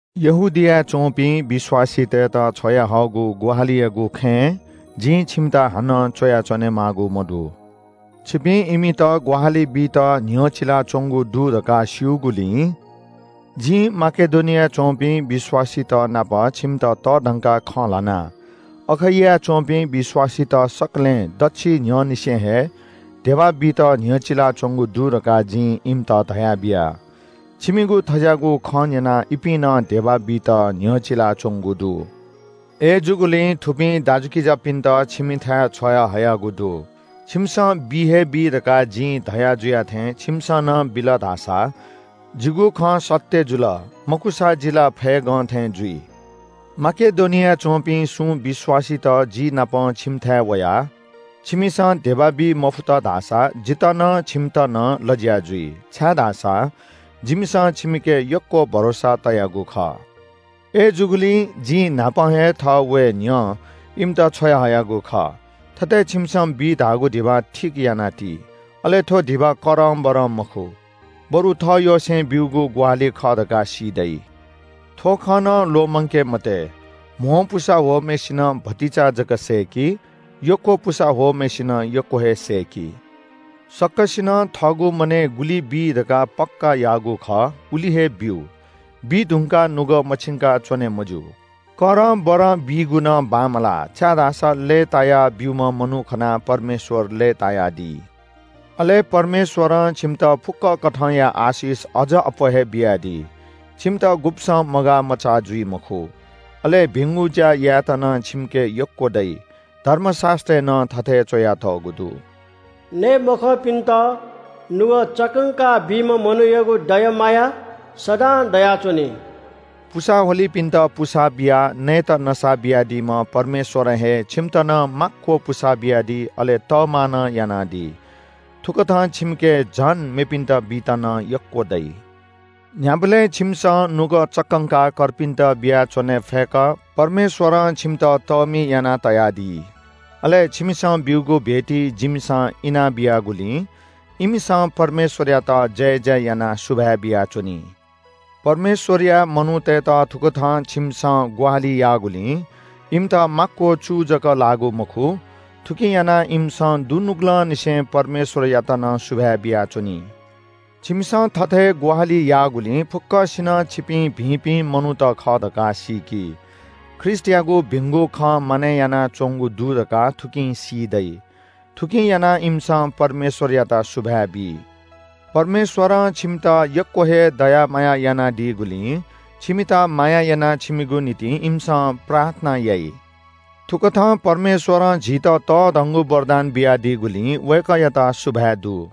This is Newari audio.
यहूदियाय् च्‍वंपिं विश्‍वासीतय्‌त छ्वयाहःगु ग्‍वाहालियागु खँय् जिं छिमित हानं च्‍वया च्‍वनेमाःगु मदु। छिपिं इमित ग्‍वाहालि बीत न्‍ह्यचिलाच्‍वंगु दु धकाः स्‍यूगुलिं जिं माकेडोनियाय् च्‍वंपिं विश्‍वासीतनाप छिमित तःधंकाः खँ ल्‍हाना। अखैयाय् च्‍वंपिं विश्‍वासीत सकलें दच्‍छि न्‍ह्यःनिसें हे धिबा बीत न्‍ह्यचिलाच्‍वंगु दु धकाः जिं इमित धयाबिया। छिमिगु थज्‍याःगु खँ न्‍यनाः इपिं नं धिबा बीत न्‍ह्यचिलाच्‍वंगु दु। अय्‌जूगुलिं थुपिं दाजुकिजापिन्‍त छिमिथाय् छ्वयाहयागु दु। छिमिसं बि हे बी धकाः जिं धयाजुया थें छिमिसं नं बिल धाःसा जिगु खँ सत्‍य जुल, मखुसा जि ला फय्‌गं थें जुइ। माकेडोनियाय् च्‍वंपिं सुं विश्‍वासीत जि नाप छिमिथाय् वयाः छिमिसं धिबा बी मफुत धाःसा जितः नं छिमित नं लज्‍या जुइ, छाय्‌धाःसा जिमिसं छिमिके यक्‍व भरोसा तयागु खः। अय्‌जूगुलिं जिं न्‍हापां हे थः वये न्‍ह्यः इमित छ्वयाहयागु खः। थथे छिमिसं बी धाःगु धिबा ठीक याना ति। अले थ्‍व धिबा करंबरं मखु, बरु थःयसें ब्‍यूगु ग्‍वाहालि खः धकाः सी दइ। थ्‍व खँ नं ल्‍वःमंके मते – कम पुसा ह्वःम्‍हय्‌सिनं भतिचा जक सय्‌की। यक्‍व पुसा ह्वःम्‍हय्‌सिनं यक्‍व हे सय्‌की। सकसिनं थःगु मनय् गुलि बी धकाः पक्‍का याःगु खः उलि हे ब्‍यु। बीधुंकाः नुगः मछिंका च्‍वने मज्‍यू, करंबरं बीगु नं बांमलाः, छाय्‌धाःसा लय्‌तायाः ब्‍यूम्‍ह मनू खनाः परमेश्‍वर लय्‌तायादी। अले परमेश्‍वरं छिमित फुक्‍क कथंया आशिष अझ अप्‍वः हे बियादी। छिमित गुब्‍सं मगाःमचाः जुइ मखु। अले भिंगु ज्‍या यायेत नं छिमिके यक्‍व दइ। धर्मशास्‍त्रय् नं थथे च्‍वयातःगु दु – “नये मखंपिन्‍त नुगः चक्‍कंकाः बीम्‍ह मनूयागु दया माया सदां दयाच्‍वनी।” पुसा ह्वलीपिन्‍त पुसा बियाः नयेत नसा बियादीम्‍ह परमेश्‍वरं हे छिमित नं माक्‍व पुसा बियादी अले तःमा नं यानादी। थुकथं छिमिके झन मेपिन्‍त बीत नं यक्‍व दइ। न्‍ह्याबलें छिमिसं नुगः चक्‍कंकाः कर्पिन्‍त बियाच्‍वने फय्‌क परमेश्‍वरं छिमित तःमि यानातयादी। अले छिमिसं ब्‍यूगु भेटी जिमिसं इना बियागुलिं इमिसं परमेश्‍वरयात जयजय यानाः सुभाय् बियाच्‍वनी। परमेश्‍वरया मनूतय्‌त थुकथं छिमिसं ग्‍वाहालि याःगुलिं इमित माक्‍व चू जक लाःगु मखु, थुकिं यानाः इमिसं दुनुगलंनिसें परमेश्‍वरयात नं सुभाय् बियाच्‍वनी। छिमिसं थथे ग्‍वाहालि याःगुलिं फुक्‍कसिनं छिपिं भिंपिं मनूत खः धकाः सीकी। ख्रीष्‍टयागु भिंगु खँ मानय् यानाच्‍वंगु दु धकाः थुकिं सी दइ। थुकिं यानाः इमिसं परमेश्‍वरयात सुभाय् बी। परमेश्‍वरं छिमित यक्‍व हे दया माया यानादीगुलिं छिमित माया यानाः छिमिगु निंतिं इमिसं प्रार्थना याइ। थुकथं परमेश्‍वरं झीत तःधंगु वरदान बियादीगुलिं वय्‌कःयात सुभाय् दु।